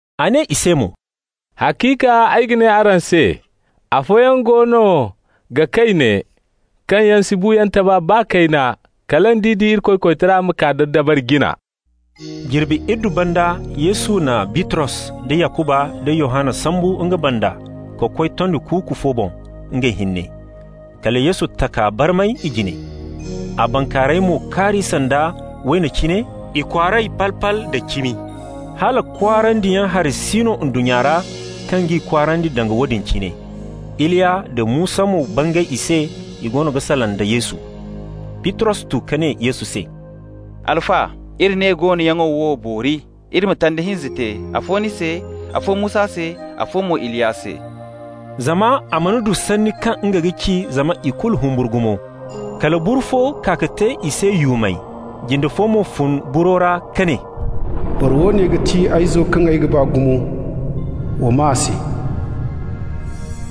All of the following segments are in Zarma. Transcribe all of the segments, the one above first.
A ne i se mo: «Haciika ay ga ne araŋ se: afooyaŋ goono ga kay ne, kaŋ yaŋ si buuyaŋ taba baa kayna kala nd'i di Irikoy koytara ma kaa da dabari jina.» Jirbi iddu banda Yesu na Bitros da Yakuba nda Yohanna sambu nga banda ka koy tondi kuuku fo boŋ, ngey hinne. Kala Yesu taka barmay i jine. A bankaarayey mo kaari sanda wayna cine, ikwaaray pal-pal da cimi, hala kwaarandiyaŋ hari si no ndunnya ra kaŋ g'i kwaarandi danga woodin cine. Iliya nda Musa mo bangay i se, i goono ga salaŋ da Yesu. Bitros tu ka ne Yesu se: «Alfa, iri ne goonoyaŋo wo boori. Iri ma tanda hinza te, afo ni se, afo Musa se, afo mo Iliya se.» Zama a mana du sanni kaŋ nga ga ci, zama ikulu humburu gumo. Kala buru fo kaa ka te i se yuumay. Jinde fo mo fun buro ra ka ne: «Boro woone ga ti ay Izo kaŋ ay ga ba gumo. Wa maa a se.»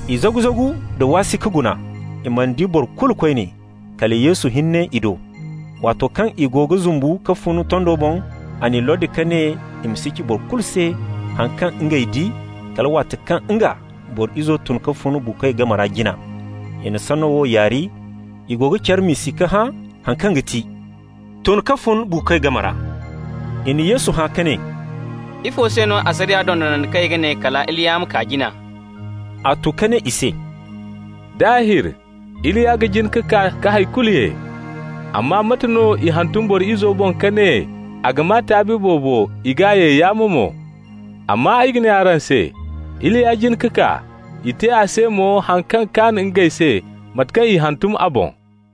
I zagu-zagu da waasi ka guna. I mana di boro kulu koyne, kala Yesu hinne i do. Waato kaŋ i go ga zumbu ka fun tondo boŋ, a n'i lordi ka ne i ma si ci boro kulu se haŋ kaŋ ngey di, kala waati kaŋ nga, Boro Izo tun ka fun buukoy game ra jina. I na sanno wo yaari, i go ga care miisi ka hã haŋ kaŋ ga ti «tun ka fun buukoy game ra». I na Yesu hã ka ne: «Ifo se no asariya dondonandikoy ga ne kala Iliya ma kaa jina?» A tu ka ne i se: «Daahir Iliya ga jin ka kaa ka hay kulu ye. Amma mate no i hantum Boro Izo boŋ ka ne a ga maa taabi boobo, i g'a ye yaamo mo? Amma ay ga ne araŋ se: Iliya jin ka kaa, i te a se mo haŋ kaŋ kaan ngey se, mate kaŋ i hantum a boŋ.»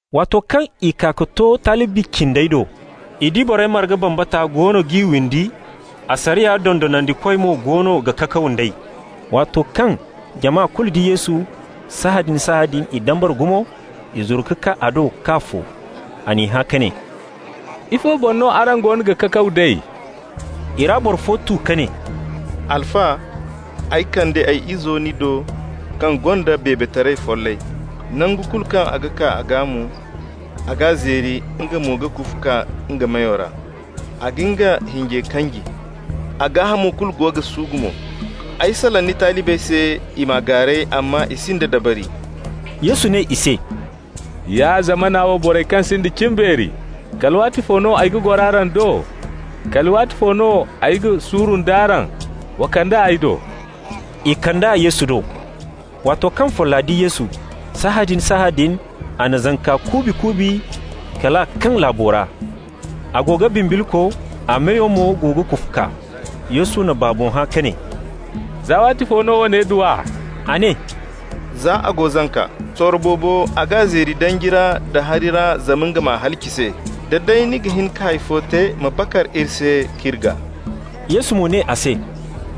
Waato kaŋ i kaa ka to talibi cindey do, i di borey marga bambata goono g'i windi, asariya dondonandikoy mo go no ga kakaw d'ey. Waato kaŋ jama kulu di Yesu, sahãadin-sahãadin i dambara gumo. I zuru ka kaa a do k'a fo. A n'i hã ka ne: «Ifo boŋ no araŋ goono ga kakaw d'ey?» I ra boro fo tu ka ne: «Alfa, ay kande ay izo ni do kaŋ gonda beebetaray follay. Nangu kulu kaŋ a ga kaa a gaa mo, a g'a zeeri, nga mo ga kufu kaa nga meyo ra. A ga nga hinjey kanji. A gaahamo kulu go ga suugu mo. Ay salaŋ ni talibey se, i m'a gaaray, amma i sinda dabari.» Yesu ne i se: «Ya zamana wo borey kaŋ sinda cimbeeri! Kala waatifo no ay ga goro araŋ do? Kala waatifo no ay ga suuru nd'araŋ? Wa kand'a ay do.» I kand'a Yesu do. Waato kaŋ folla di Yesu, sahãadin-sahãadin a na zanka kuubi-kuubi kal a kaŋ laabo ra. A go ga bimbilko, a meyo mo go ga kufu kaa. Yesu na baabo hã ka ne: «Za waatifo no woone du a?» A ne: «Za a go zanka. Sorro boobo a g'a zeeri danji ra nda hari ra zama nga m'a halaci se. Day da ni ga hin ka hay fo te, ma bakar iri se k'iri gaa.» Yesu mo ne a se: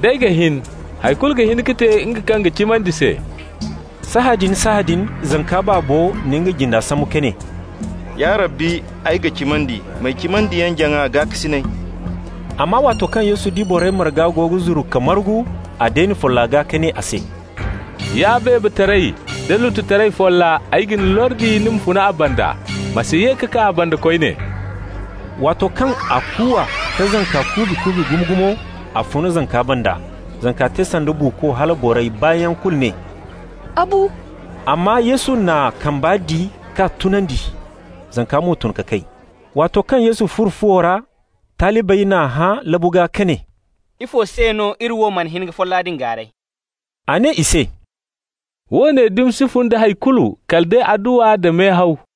«D'ay ga hin! Hay kulu ga hin ka te nga kaŋ ga cimandi se.» Sahãadin-sahãadin zanka baabo na nga jinda sambu ka ne: «Ya Rabbi! Ay ga cimandi! M'ay cimandiyaŋ-jaŋa gaakasinay!» Amma waato kaŋ Yesu di borey marga go ga zuru ka margu, a deeni folla gaa ka ne a se: «Ya beebetaray da lututaray folla, ay ga ni lordi ni ma fun a banda. Ma si ye ka kaa a banda koyne.» Waato kaŋ a kuuwa ka zanka kuubi-kuubi gumo-gumo, a fun zanka banda. Zanka te sanda buuko, hala borey baayaŋ kulu ne: «A bu.» Amma Yesu n'a kamba di k'a tunandi. Zanka mo tun ka kay. Waato kaŋ Yesu furo fuwo ra, talibey n'a hã labu gaa ka ne: «Ifo se no iri wo mana hin ka folla din gaaray?» A ne i se: «Woone dumi si fun da hay kulu kala day adduwa nda mehaw.»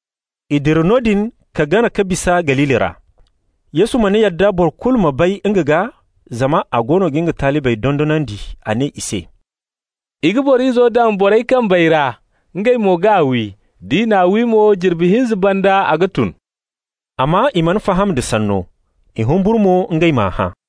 I dira noodin ka gana ka bisa Galili ra. Yesu mana yadda boro kulu ma bay nga gaa, zama a goono ga nga talibey dondonandi. A ne i se: «I ga Boro Izo daŋ borey kambey ra, ngey mo g'a wi. D'i n'a wi mo, jirbi hinza banda a ga tun.» Amma i mana faham da sanno. I humburu mo ngey m'a hã.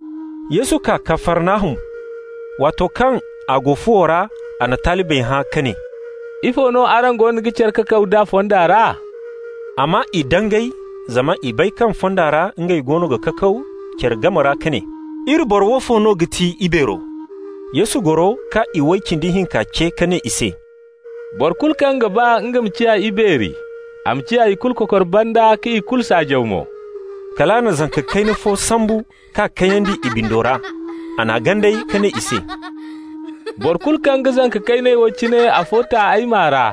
Yesu kaa Kafarnahum. Waato kaŋ a go fuwo ra, a na talibey hã ka ne: «Ifo no araŋ goono ga care kakaw d'a fonda ra?» Amma i dangay, zama i bay kaŋ fonda ra ngey goono ga kakaw care game ra ka ne: «Iri boro woofo no ga ti ibeero?» Yesu goro ka iway cindi hinka ce ka ne i se: «Boro kulu kaŋ ga ba nga ma ciya ibeeri, a ma ciya ikulu kokor banda ka ikulu saajaw mo.» Kal a na zanka kayna fo sambu k'a kayandi i bindo ra. A n'a ganday ka ne i se: «Boro kulu kaŋ ga zanka kayney wo cine afo ta ay maa ra,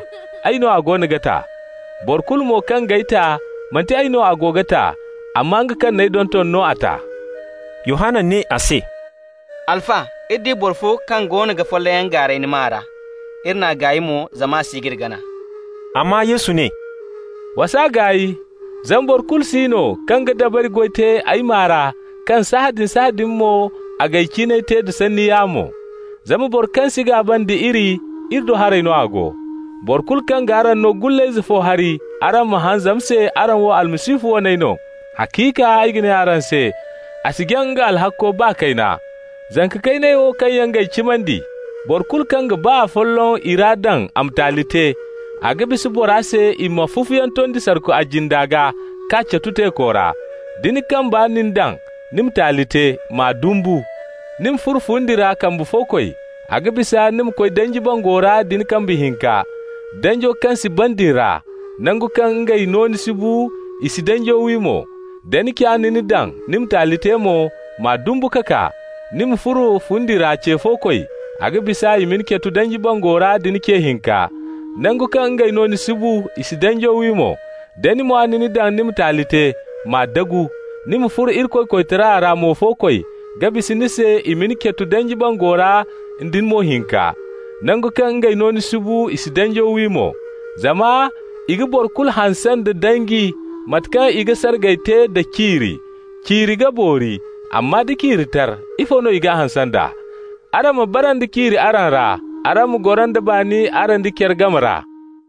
ay no a goono ga ta. Boro kulu mo kaŋ g'ay ta, manti ay no a ga ta, amma nga kaŋ n'ay donton no a ta.» Yohanna ne a se: «Alfa, iri di boro fo kaŋ goono ga follayyaŋ gaaray ni maa ra. Iri n'a gaay mo, zama a si ga iri gana.» Amma Yesu ne: «Wa s'a gaay. Zama boro kulu si no kaŋ ga dabari goy te ay maa ra kaŋ sahãadin-sahãadin mo a g'ay ciinay te da sanni yaamo. Zama boro kaŋ si gaaba nda iri, iri do haray no a go. Boro kulu kaŋ g'araŋ no gullayze fo hari araŋ ma haŋ zama se araŋ wo Almasihu waney no, haciika ay ga ne araŋ se, a si jaŋ nga alhakko, baa kayna.» «Zanka kayney wo kaŋ yaŋ g'ay cimandi, boro kulu kaŋ ga baa afolloŋ i ra daŋ a ma taali te, a ga bisa bora se i ma fufuyaŋ tondi sarku a jinde gaa k'a catu teeko ra. Da ni kambe na ni daŋ ni ma taali te, m'a dumbu! Ni ma furo fundi ra kambe-fo-koy, a ga bisa ni ma koy danji bango ra nda ni kambe hinka, danjo kaŋ si ban din ra. Nangu kaŋ ngey nooni si bu, i si danjo wi mo. Da ni ca na ni daŋ ni ma taali te mo, m'a dumbu ka kaa! Ni ma furo fundi ra ce-fo-koy, a ga bisa i ma ni catu danji bango ra nda ni ce hinka. Nangu kaŋ ngey nooni si bu, i si danjo wi mo. Da ni mwa na ni daŋ ni ma taali te, m'a dagu! Ni ma furo Irikoy koytara ra mo-fo-koy ga bisa ni se i ma ni catu danji bango ra nda ni mo hinka. Nangu kaŋ ngey nooni si bu, i si danjo wi mo. Zama i ga boro kulu hanse nda danji, mate kaŋ i ga sargay te nda ciiri. Ciiri ga boori, amma nda ciiri tar, ifo no i g'a hanse nd'a? Araŋ ma bara nda ciiri araŋ ra, araŋ ma goro nda baani araŋ da care game ra.»